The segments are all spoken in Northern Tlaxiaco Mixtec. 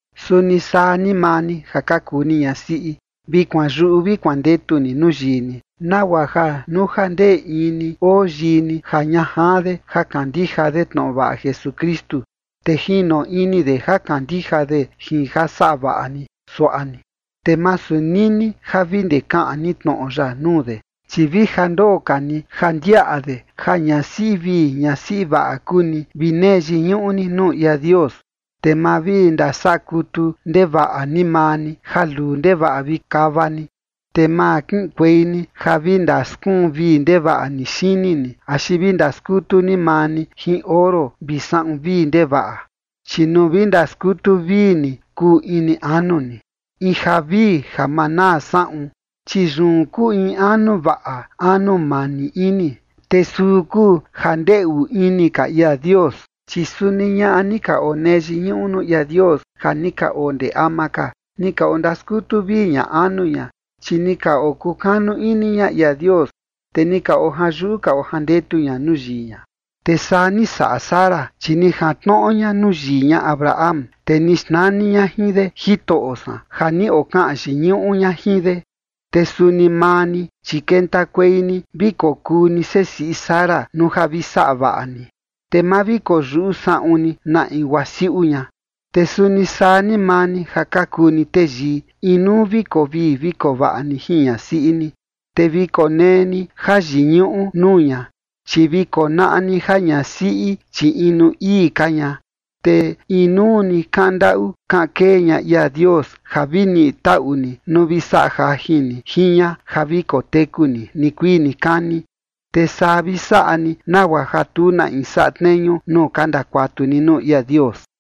Suni saa ni maa ni ja ka kuu ni ñasiꞌi, vi kuanyuꞌu vi kuandetu ni nuu yii ni, nagua ja nuu ja ndee in ni oo yii ni ja ña jaan de ja kandija de tnoꞌo vaꞌa Jesukristu, te jino ini de ja kandija de jin ja saꞌa vaꞌa ni suaꞌa ni. Te masu nini ja vi ndee kaꞌan ni tnoꞌo ya nuu de, chi vi ja ndoo ka ni ja ndiaꞌa de ja ñasiꞌi vii ñasiꞌi vaꞌa kuu ni vi nee yiñuꞌu ni nuu ia Dios. Te ma vi ndasaꞌa kutu ndevaꞌa ni maa ni ja luu ndevaꞌa vi kava ni. Te ma kiꞌinkuei ni ja vi ndaskuun vii ndevaꞌa xini ni axi vi ndaskutu ni maa ni jin oro vi saꞌun vii ndevaꞌa. Chi nuu vi ndaskutu vii ni kuu ini anu ni, in ja vii ja maa naa saꞌun, chi yun kuu in anu vaꞌa anu mani ini, te suu kuu ja ndeꞌu ini ka ia Dios. Chi suni ñaꞌa ni ka onee yiñuꞌu nuu ia Dios ja ni ka oo ndee ama ka, ni ka ondaskutu vii ña anu ña, chi ni ka okukanu ini ña ia Dios, te ni ka ojanyuꞌu ka ojandetu ña nuu yii ña. Te saa ni saꞌa Sara, chi ni jantnoꞌo ña nuu yii ña Abraham, te ni xnani ña jin de “jitoꞌo san” ja ni okaꞌan yiñuꞌu ña jin de. Te suni maa ni, chi kentakuei ni vi kokuu ni sesiꞌi Sara nuu ja vi saꞌa vaꞌa ni, te ma vi koyuꞌu saꞌun ni na in guaa siuꞌu ña. Te suni saa ni maa ni ja ka kuu ni teyii, inuu ni vi koo vii vi koo vaꞌa ni jin ñasiꞌi ni. Te vi konee ni jayiñuꞌu nuu ña, chi vi konaꞌa ni ja ñasiꞌi, chi inu ii ka ña, te inuu ni kaꞌan ndaꞌu kaꞌan kee ña ia Dios, ja vi niꞌi taꞌu ni nuu vi saꞌa jajin ni jin ña ja vi koteku ni nikuii nikani. Te saa vi saꞌa ni nagua ja tu na in saꞌa tneñu nuu ka ndakuatu ni nuu ia Dios.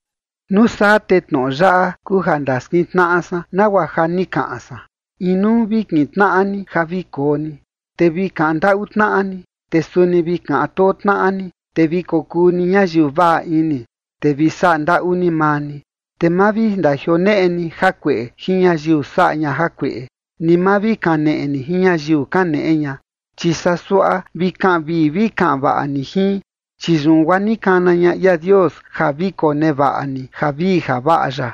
Nuu saa te tnoꞌo yaꞌa kuu ja ndaskintnaꞌa san nagua ja ni kaꞌan san. Inuu vi kintnaꞌa ni ja vi koo ni, te vi kaꞌan ndaꞌu tnaꞌa ni, te suni vi kaꞌan too tnaꞌa ni, te vi kokuu ni ñayiu vaꞌa ini, te vi saꞌa ndaꞌu ni maa ni. Te ma vi ndajioneꞌe ni jakueꞌe jin ñayiu saꞌa ña jakueꞌe, ni ma vi kaneꞌe ni jin ñayiu kaneꞌe ña, chi saa suaꞌa vi kaꞌan vii vi kaꞌan vaꞌa ni jin, chi yun guaa ni kana ña ia Dios ja vi konevaꞌa ni javii javaꞌa ya.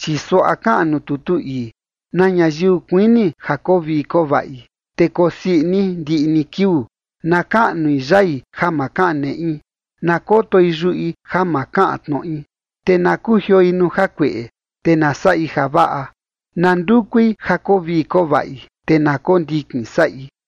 Chi suaꞌa kaꞌan nuu tutu ii: Na ñayiu kuini ja koo vii koo vaꞌi, te kosii ini ndiꞌi ni kiuu, na kaꞌnui yai ja ma kaꞌan neꞌi, na kotoi yuꞌi ja ma kaꞌan tnoꞌi. Te na kujioi nuu jakueꞌe, te na saꞌi javaꞌa. Na ndukui ja koo vii koo vaꞌi, te na kondikin saꞌi.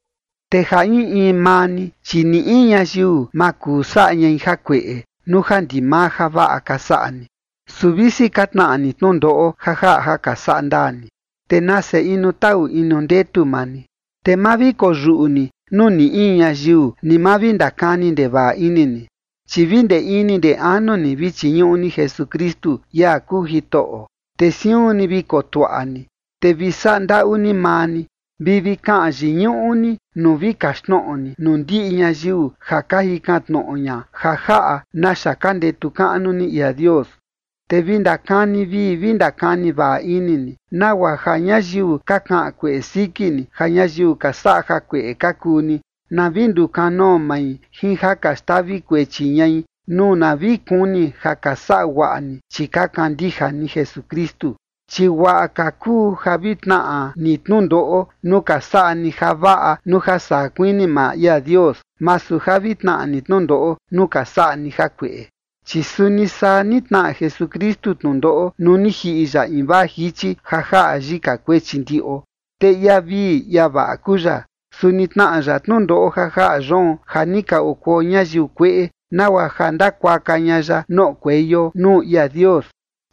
Te ja in in maa ni, chi ni in ñayiu ma kuu saꞌa ñai jakueꞌe nuu ja ndimaa javaꞌa ka saꞌa ni. Su visi ka tnaꞌa ni tnundoꞌo ja jaꞌa ja ka saꞌa ndaa ni, te nase inu taꞌu inu ndetu maa ni. Te ma vi koyuꞌu ni nuu ni in ñayiu ni ma vi ndakani ndevaꞌa ini ni. Chi vi ndee ini ndee anu ni vi chiñuꞌu ni Jesukristu, ia kuu Jitoꞌo, te siun ni vi kotuaꞌa ni, te vi saꞌa ndaꞌu ni maa ni vi vi kaꞌan yiñuꞌu ni nuu vi kaxtnoꞌo ni nuu ndiꞌi ñayiu ja ka jikan tnoꞌo ña ja jaꞌa naxa ka ndetu kaꞌnu ni ia Dios. Te vi ndakani vii vi ndakani vaꞌa ini ni, nagua ja ñayiu ka kaꞌan kueꞌe siki ni ja ñayiu ka saꞌa jakueꞌe ka kuu ni, na vi ndukanoo mai jin ja ka xtavi kuechi ñai nuu na vi kuni ja ka saꞌa guaꞌa ni, chi ka kandija ni Jesukristu. Chi guaꞌa ka kuu ja vi tnaꞌa ni tnundoꞌo nuu ka saꞌa ni javaꞌa nuu ja saa kuini maa ia Dios, masu ja vi tnaꞌa ni tnundoꞌo nuu ka saꞌa ni jakueꞌe. Chi suni saa ni tnaꞌa Jesukristu tnundoꞌo nuu ni jiꞌi ya invaa jichi ja jaꞌa yika kuechi ndiꞌo. Te ia vii ia vaꞌa kuu ya, su ni tnaꞌa ya tnundoꞌo ja jaꞌa yoon ja ni ka okuo ñayiu kueꞌe, nagua ja ndakuaka ña ya noꞌokueio nuu ia Dios.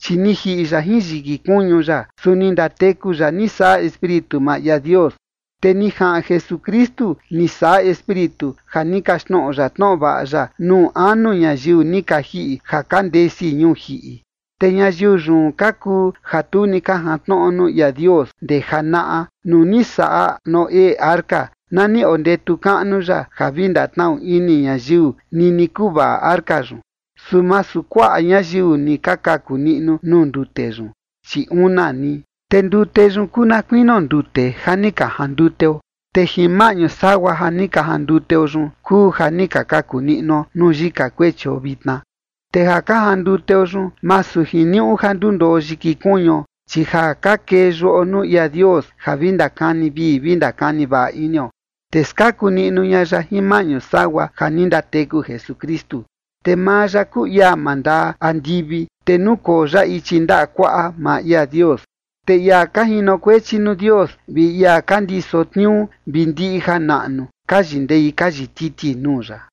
Chi ni jiꞌi ya jin yiki kuñu ya, su ni ndateku ya ni saꞌa Espíritu maa ia Dios. Te ni jaꞌan Jesukristu ni saꞌa Espíritu ja ni kaxtnoꞌo ya tnoꞌo vaꞌa ya nuu anu ñayiu ni ka jiꞌi ja ka ndesi ñuu jiꞌi. Te ñayiu yun ka kuu ja tu ni ka jantnoꞌo nuu ia Dios ndee janaꞌa, nuu ni saꞌa Noé arca, na ni ondetu kaꞌnu ya ja vi ndatnaꞌu ini ñayiu nini kuvaꞌa arca yun. Su masu kuaꞌa ñayiu ni ka kaku niꞌnu nuu ndute yun, chi una ni. Te ndute yun kuu na kuinio ndute ja ni ka janduteo, te jin maꞌñu sagua ja ni ka janduteo yun kuu ja ni ka kaku niꞌnuo nuu yika kuechio vitna. Te ja ka janduteo yun, masu jiniuꞌu ja ndundoo yiki kuñuo, chi ja ka kee yuꞌo nuu ia Dios ja vi ndakani vii vi ndakani vaꞌa inio, te skaku niꞌnu ña ya jin maꞌñu sagua ja ni ndateku Jesukristu. Te maa ya kuu ia mandaa andivi, te nukoo ya ichi ndaꞌa kuaꞌa maa ia Dios, te ia ka jinokuechi nuu Dios vi ia ka ndiso tniuu vi ndiꞌi janaꞌnu, ka yindee ka yititi nuu ya.